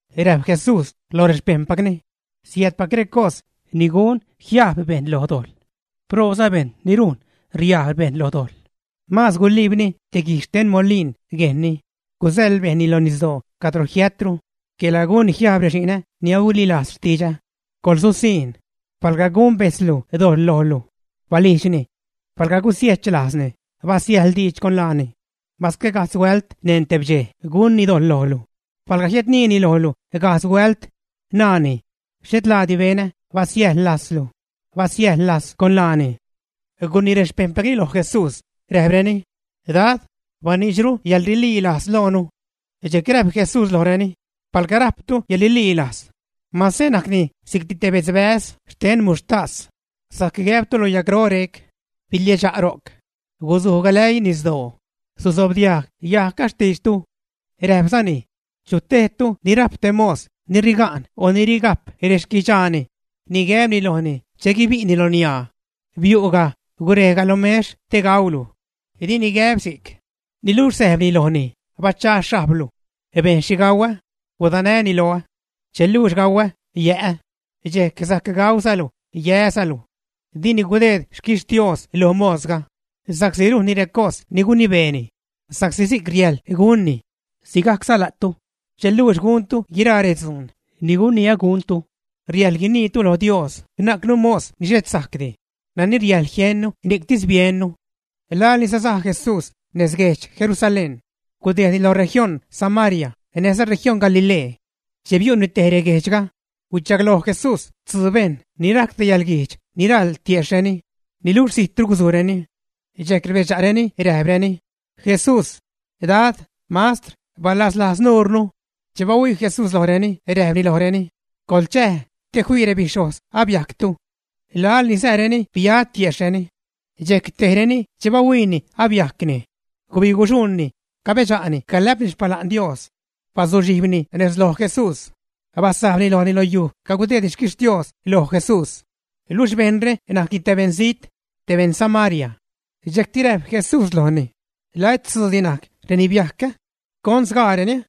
Räjp Jesús loj rexpejṉpacni: ―Siäädpac recos ni gun jiajb bejṉ lo dojḻ. Proobza bejṉ ni rujn riajb bejṉ lo dojḻ. Maaz guliibni te guij xten molin guejnni, gusäḻ bejṉni lo nisdoo cadro jiätro quela gunni jiajb rexi'nä ni ahuililajz xtidxä. ¡Coḻsusiṉ! ’Palga gun bejtzlu dojḻ lojlu, balijdxni. Palga gusiechlajzni, basiäjḻ diidx con laani. Masque gajdz huält neṉ teb dxej gunni dojḻ lojlu, palga jiädniini lojlu gajdz huält, naani: “Xhet laadi benä, basiäjḻ lajzlu”, basiäjḻ lajz con laani. Gunii rexpejṉpacni lo Jesús, räjpreni: ―Dad, baniidxru yäḻrililajz loonu. Dxejc räjp Jesús lojreni: ―Palga rajptu yäḻrililajz, mase najcni si'cti te bedzbäz xten muxhtas, sajc gäbtu lo yagro rec: “Biliädxa' ro'c, guzuj galäii nisdoo”, susobdiajg yajgga xtiidxtu. Räjpzani: ―¿Chu tejtu ni rajp te mos ni riga'n o ni rigajp rexquidxaani ni gäbni lojni che guibi'ni lo niaa: “Biu'ga, gurej lo mex te gaulu”? Dini gäb si'c. Niluxh säjpni lojni: “Bachaa xhajblu. Bejn xhi gauä, gudanäni loä. Che luux gauä, yä'ä, dxejc sajc gauzalu, yäzalu.” Dini gudeed xquixtios lo mosga sa'csi rujnni recos ni gunibeeni sa'csi si'c riäjḻ gunni. Sigajcza la'tu, che luux guntu guiraa redzuun ni guniä guntu, riäjḻ guiniitu lo Dios: “Najcnu mos ni xhet sajcdi, nani riäjḻ jiennu, ni'ctis biennu.” Laḻ ni sasaj Jesús nez guedx Jerusalén, gudejdni loj región Samaria näjza región Galilee. Che biu'ni tej reguejdxga, huichagloj Jesús tzuu bejṉ ni rajc te yäḻguijdx ni raḻ tiejxhreni, niluxh zijtru guzujreni. Dxejc rbedxa'reni räjpreni: ―Jesús, Dad, Mastr, balaslajz nuurnu. Che bahuii Jesús lojreni, räjpni lojreni: ―Coḻchäj, te fii rebixhojz abiajctu. Laḻ ni sääreni, bia tiejxhreni. Dxejc tejreni, che bahuiini abiajcni, gubiguxuṉni, cabedxa'ni calä'pni xpala'n Dios. Bazuxhijbni nez loj Jesús, basajbni lojni lo yuj cagudeedni xquixtios loj Jesús. Luxh bejṉre najc te beṉzijt, te beṉ Samaria. Dxejcti räjp Jesús lojni: ―¿La et tzuudi najc reni biajc, ä? ¿Con sgaareni?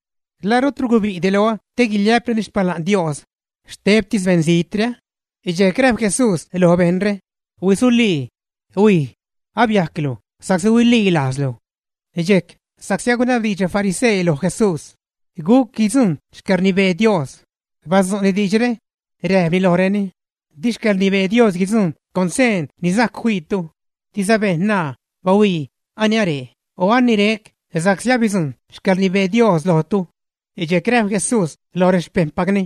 ¿La rutru gubi'di loä te guiliä'preni xpala'n Dios, xtebtis beṉzijtre, ä? Dxejc räjp Jesús loj bejṉre: ―¡Huisulii, huij! Abiajclu sa'csi huililajzlu. Dxejc, sa'csi agunabdiidx refarisee loj Jesús guc guidzujṉ xcäḻrnibee Dios, badzu'ni diidxre, räjpni lojreni: ―Di xcäḻrnibee Dios guidzujṉ con seen ni sajc fiitu. Diza bejṉ naa: “Bahuii, aniree”, o “Anirec”, sa'csi abidzujṉ xcäḻrnibee Dios lojtu. Dxejc räjp Jesús lo rexpejṉpacni: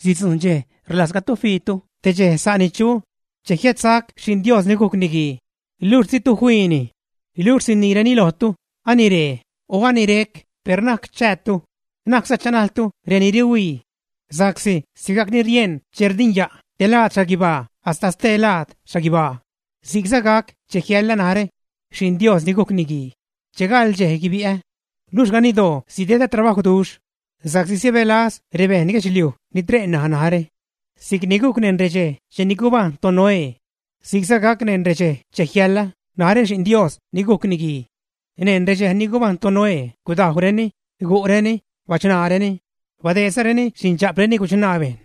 ―Sidzujṉ dxej rlajzgatu fiitu te dxej sa' ni chu che jiädsac Xi'n Dios ni gujc Niguii, luxh ditu fiini. Luxh siniireni lojtu: “Aniree”, o “Anirec”, per na'c chäätu, na'cza chanajltu reni rihuii. Sa'csi sigajc ni rieṉ che rdinya' te laad xhaguibaa hasta stelaad xhaguibaa, si'cza gac che jiälä narä, Xi'n Dios ni gujc Niguii, che gaḻ dxej guibi'ä. Luxh ganiddoo sidedä trabajwduxh, sa'csi sibälaz rebeṉ guedxliuj ni tre' ṉaj narä. Si'cni gujc neṉ redxej cheni gubajṉ toNoé, si'cza gac neṉ redxej che jiälä narä, Xi'n Dios ni gujc Niguii. Neṉ redxej ni gubajṉ toNoé gudajwreni, gu'reni, bachṉaareni, badeedzareni xindxa'preni guchṉaa bejṉ,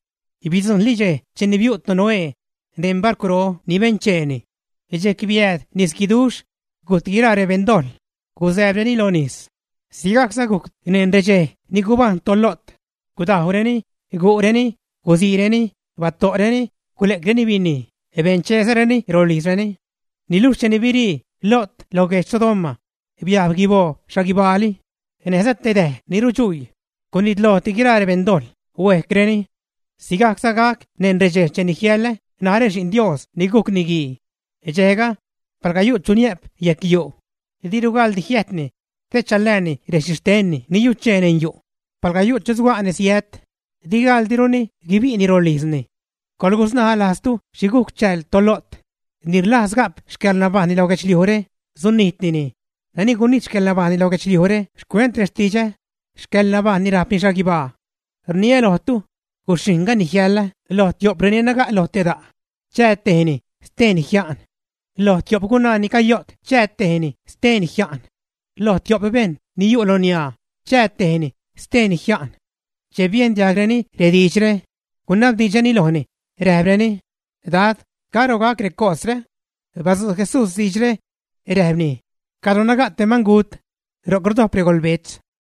bidzujṉli dxej cheni biu' toNoé neṉ barcwro ni bencheeni. Dxejc biääd nisguiduxh, gujt guiraa rebeṉ dojḻ, guzääbreni lo nis. Sigajcza gujc neṉ redxej ni gubajṉ toLo't: gudajwreni, gu'reni, gusiireni, bato'reni, gule'creni binij, bencheezareni rolijzreni. Niluxh cheni birii Lo't lo guedx Sodoma, biajb guiboo xhaguibaali, näjza te däj ni rudxuii, gunitlojti guiraa rebejṉ dojḻ, huejcreni. Sigajcza gac neṉ redxej cheni jiälä narä, Xi'n Dios ni gujc Niguii. ’Dxejga, palga yu' chu niä'p yejc yu', diru gaḻdi jiäjtni te chalääni rexhixtenni ni yuchee neṉ yu'; palga yu' chu suga' nezjiät, di gaḻdiruni guibi'ni rolijzni. Coḻgusnaj lajztu xhi gujc chääl toLo't. Ni rlajz ga'p xcäḻnabajṉni lo guedxliujre, sunijtnini, nani gunijt xcäḻnabajṉni lo guedxliujre xcuent rextidxä, xcäḻnabajṉni rajpni xhaguibaa. ’Rniä lojtu, guxhijṉga ni jiälä lo tio'p reni naga' lo te da', chää tejni, steeni jia'n. Lo tio'p gunaa ni cayo't, chää tejni, steeni jia'n. Lo tio'p bejṉ ni yu' lo niaa, chää tejni, steeni jia'n. Che biejn diajgreni rediidxre, gunabdiidxreni lojni, räjpreni: ―Dad, ¿caro gac recosre? Badzu' Jesús diidxre, räjpni: ―Cadro naga' te mangut, ro'c rdojp regolbetz.